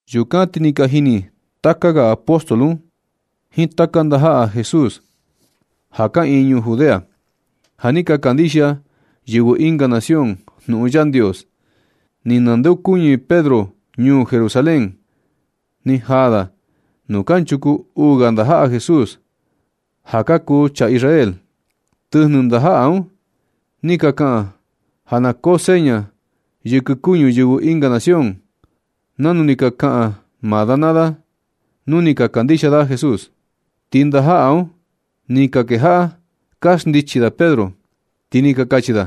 Yukan ti ni ka jini taka ga apóstol un jiin taka ndajaꞌa Jesús kaꞌiin ñuu Judea, ja ni ka kandixia yɨvɨ ɨnga nación jnuꞌun Yandios. Ni nandeokuñɨ Pedro ñuu Jerusalén. Ni jaa da nuu kanchuku uu ga ndajaꞌa Jesús, ja ka kuu chaa Israel. Tɨjnɨ ndajaꞌa un ni ka kaꞌan ja na koo seña yɨkɨ kuñu yɨvɨ ɨnga nación nanu ni ka kaꞌan maa da naa da un ni ka kandixia da Jesús. Ti ndajaꞌa un ni ka kejaꞌa ka xndichi da Pedro, ti ni ka kachi da: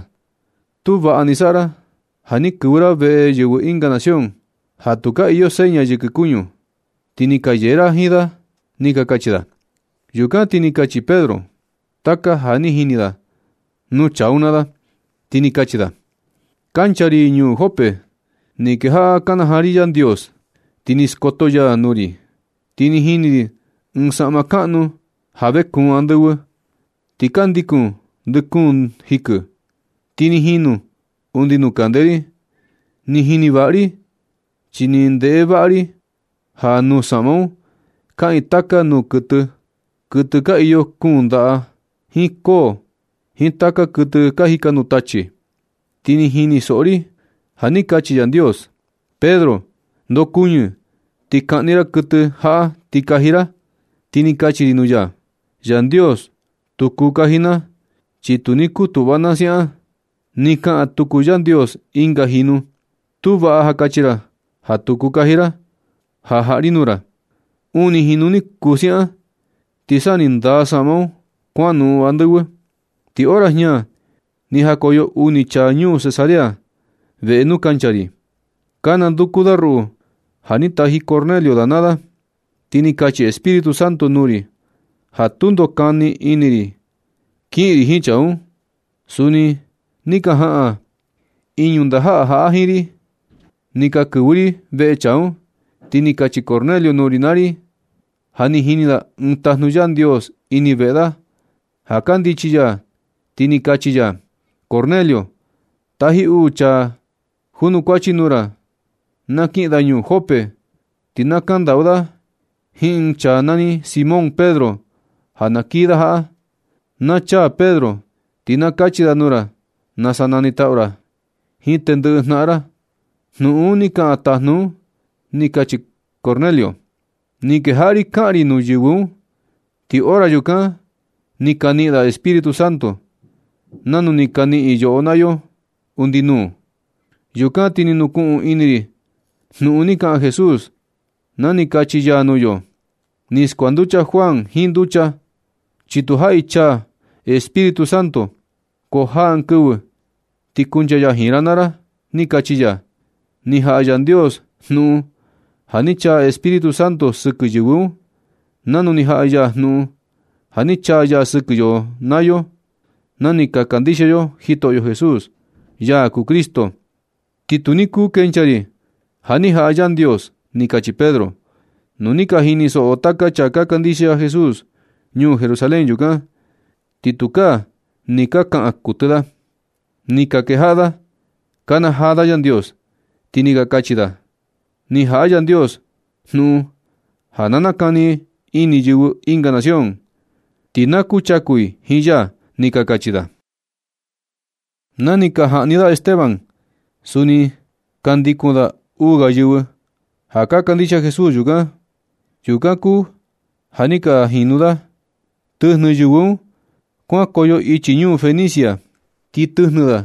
―Tu vaꞌa ni saꞌa ra ja ni kɨvɨ ra veꞌe yɨvɨ ɨnga nación ja tu ka iyo seña yɨkɨ kuñu, ti ni ka yee ra jiin da ―ni ka kachi da. Yukan ti ni kachi Pedro taka ja ni jini da nuu chaa un naa da, ti ni kachi da: ―Kancha ra ñuu Jope. Ni kejaꞌa kanajaa ri Yandios, ti ni skoto ya nuu ri. Ni jini ri ɨɨn saꞌma kaꞌnu ja vekuun andɨvɨ, ti ka ndikun ndɨ kuun jikɨ, ti ni jinu undi nuu kande ri. Ni jini vaꞌa ri chi ni ndeꞌe vaꞌa ri ja nuu saꞌma un kaꞌiin taka nuu kuɨtɨ, kuɨtɨ ka iyo kuun ndaꞌa, jiin koo, jiin taka kuɨtɨ ka jika nuu tachi. Ti ni jini soꞌo ri ja ni kachi Yandios: “Pedro, ndokuɨñɨ ti kaꞌni ra kuɨtɨ jaꞌa ti kaji ra.” Ti ni kachi ri nuu ya: “Yandios, tu kuu kaji na, chi tu ni kutuꞌva na siaꞌan” Ni kaꞌan tuku Yandios ɨnga jinu: “Tu vaꞌa ja kachi ra ja tu kuu kaji ra ja jaꞌa ri nuu ra.” Uni jinu ni kuu siaꞌan, ti sa ni ndaa saꞌma un kuanoꞌon andɨvɨ. Ti hora jña ni jakoyo uni chaa ñuu Cesarea veꞌe nuu kancha ri, ka nanduku da ruꞌu ja ni taji Cornelio da naa da. Ti ni kachi Espíritu Santo nuu ri ja tundo, kani ini ri kiꞌin ri jiin chaa un. Suni ni ka jaꞌan iñu ndajaꞌa jaꞌa jiin ri, ni ka kɨvɨ ri veꞌe chaa un. Ti ni kachi Cornelio nuu ri naa ri ja ni jini da ɨɨn tajnu Yandios ini veꞌe da, ja kandichi ya ti ni kachi ya: “Cornelio, taji uu chaa ka junukuachi nuu ra na kiꞌin da ñuu Jope, ti na kaꞌan ndaꞌu da jiin ɨɨn chaa nani Simón Pedro ja na kii da jaꞌa. Na chaa Pedro ti na kachi da nuu ra nasa nanitaꞌu ra jiin tendɨꞌɨ jnaꞌan ra.” Jnuꞌun un ni kaꞌan tajnu un, ni kachi Cornelio. Ni kejaꞌa ri kaꞌan ri nuu yɨvɨ un, ti hora yukan ni ka niꞌin da Espíritu Santo, nanu ni ka niꞌin yoꞌo naa yo undi nuu. Yukan ti ni nukuꞌun ini ri jnuꞌun ni kaꞌan Jesús na ni kachi ya nuu yo: “Ni skuanducha Juan jiin nducha, chi tu jaꞌi chaa Espíritu Santo, ko jaa ɨɨn kɨvɨ ti kuncha ya jiin ra naa ra”, ni kachi ya. Ni jaꞌa Yandios jnuꞌun ja ni chaa Espíritu Santo sɨkɨ yɨvɨ un, nanu ni jaꞌa ya jnuꞌun ja ni chaa ya sɨkɨ yoꞌo naa yo na ni ka kandixia yo Jitoꞌyo Jesús, ya kuu Cristo. Ti tu ni kuu kenchaa ri ja ni jaꞌa Yandios ―ni kachi Pedro. Nu ni ka jinisoꞌo taka chaa ka kandixia Jesús ñuu Jerusalén yukan, ti tukaa ni ka kaꞌan kuɨtɨ da. Ni ka kejaꞌa da ka nakanajaa da Yandios, ti ni ka kachi da: ―Ni jaꞌa Yandios jnuꞌun ja na nakani ini yɨvɨ ɨnga nación, ti na kuchaku i jiin ya ―ni ka kachi da. Na ni ka jaꞌni da Esteban, suni ni ka ndikun da uu ga yɨvɨ ja ka kandixia Jesús yukan. Yukan kuu ja ni ka jinu da. Tɨjnɨ yɨvɨ un kuankoyo ichi ñuu Fenicia, ti tɨjnɨ da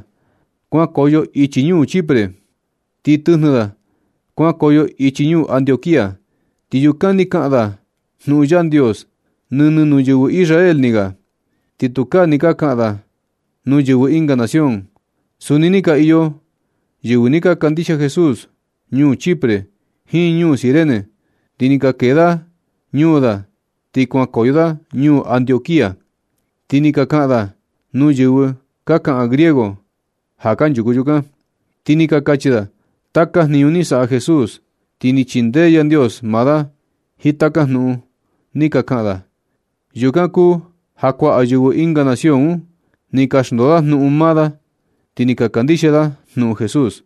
kuankoyo ichi ñuu Chipre, ti tɨjnɨ da kuankoyo ichi ñuu Antioquía. Ti yukan ni ka kaꞌan da jnuꞌun Yandios nɨnɨ nuu yɨvɨ Israel ni ga. Ti tukaa ni ka kaꞌan da nuu yɨvɨ ɨnga nación. Suni ni ka iyo yɨvɨ ni ka kandixia Jesús ñuu Chipre jiin ñuu Cirene, ti ni ka kee da ñuu da ti kuankoyo da ñuu Antioquía, ti ni ka kaꞌan da nuu yɨvɨ ka kaꞌan griego ja kanchuku yukan. Ti ni ka kachi da taka jniñu ni saꞌa Jesús. Ti ni chindee Yandios maa da jiin taka jnuꞌun ni ka kaꞌan da. Yukan kuu ja kuaꞌa yɨvɨ ɨnga nación un ni ka xndoo da jnuꞌun maa da, ti ni ka kandixia da jnuꞌun Jesús.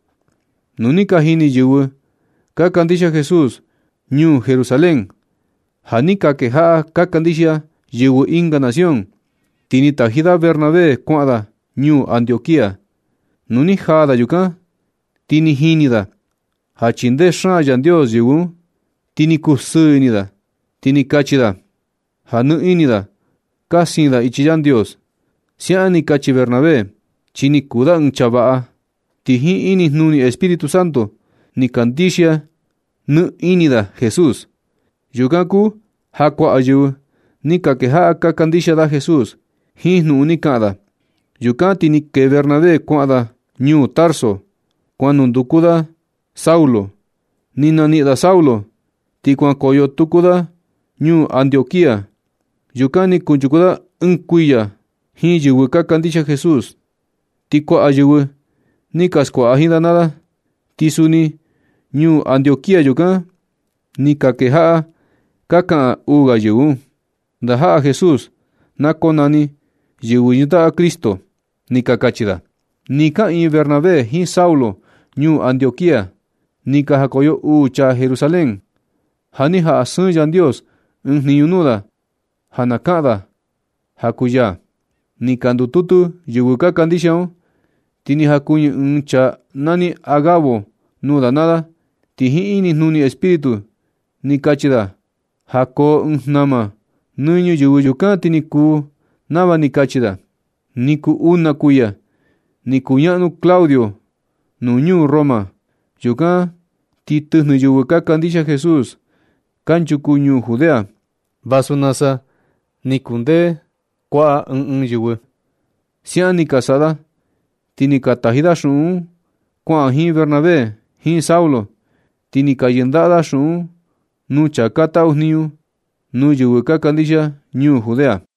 Nu ni ka jini yɨvɨ ka kandixia Jesús ñuu Jerusalén ja ni ka kejaꞌa ka kandixia yɨvɨ ɨnga nación, ti ni ka taji da Bernabé kuaꞌan da ñuu Antioquía. Nu ni jaa da yukan, ti ni jini da ja chindee xaan Yandios yɨvɨ un, ti ni kusɨɨ ini da. Ti ni kachi da ja nɨ ini da ka siin i ichi Yandios. Siaꞌan ni kachi Bernabé, chi ni kuu da ɨɨn chaa vaꞌa. Ti jiin inijnuni Espíritu Santo ni kandixia nɨ ini da Jesús. Yukan kuu ja kuaꞌa yɨvɨ ni ka kejaꞌa ka kandixia da Jesús jiin jnuꞌun ni kaꞌan da. Yukan ti ni kee Bernabé kuaꞌan da ñuu Tarso, kuan nunduku da Saulo. Ni naniꞌin da Saulo, ti kuanukoyo tuku da ñuu Antioquía. Yukan ni kunchuku da ɨɨn kuiya jiin yɨvɨ ka kandixia Jesús, ti kuaꞌa yɨvɨ ni ka skuaꞌa jiin da naa da. Ti suni ñuu Antioquía yukan, ni ka kejaꞌa ka kaꞌan uu ga yɨvɨ un: ―Ndajaꞌa Jesús na konani “Yɨvɨ yɨndaꞌa Cristo”, ―ni ka kachi da. Nɨ kaꞌiin Bernabé jiin Saulo ñuu Antioquía, ni ka jakoyo uu chaa Jerusalén. Ja ni jaꞌa sɨɨn Yandios ɨɨn jniñu nuu da ja na kaꞌan da ja kuu ya. Ni ka ndututu yɨvɨ ka kandixia un, ti ni jakuɨñɨ ɨɨn chaa nani Agabo nuu da naa da ti jiin inijnuni Espíritu ni kachi da ja koo ɨɨn jnama nɨ ñuyɨvɨ. Yukan ti ni kuu nava ni kachi da. Ni kuu un na kuiya ni kuñaꞌnu Claudio nuu ñuu Roma. Yukan ti tɨjnɨ yɨvɨ ka kandixia Jesús kanchuku ñuu Judea, vasu nasa ni kundee kuaꞌa ɨɨn ɨɨn yɨvɨ. Siaꞌan ni ka saꞌa da, ti ni ka taji da xuꞌun un kuaꞌan jiin Bernabé jiin Saulo. Ti ni ka yɨndaꞌa da xuꞌun un nuu chaa ka taꞌu jniñu nuu yɨvɨ ka kandixia ñuu Judea.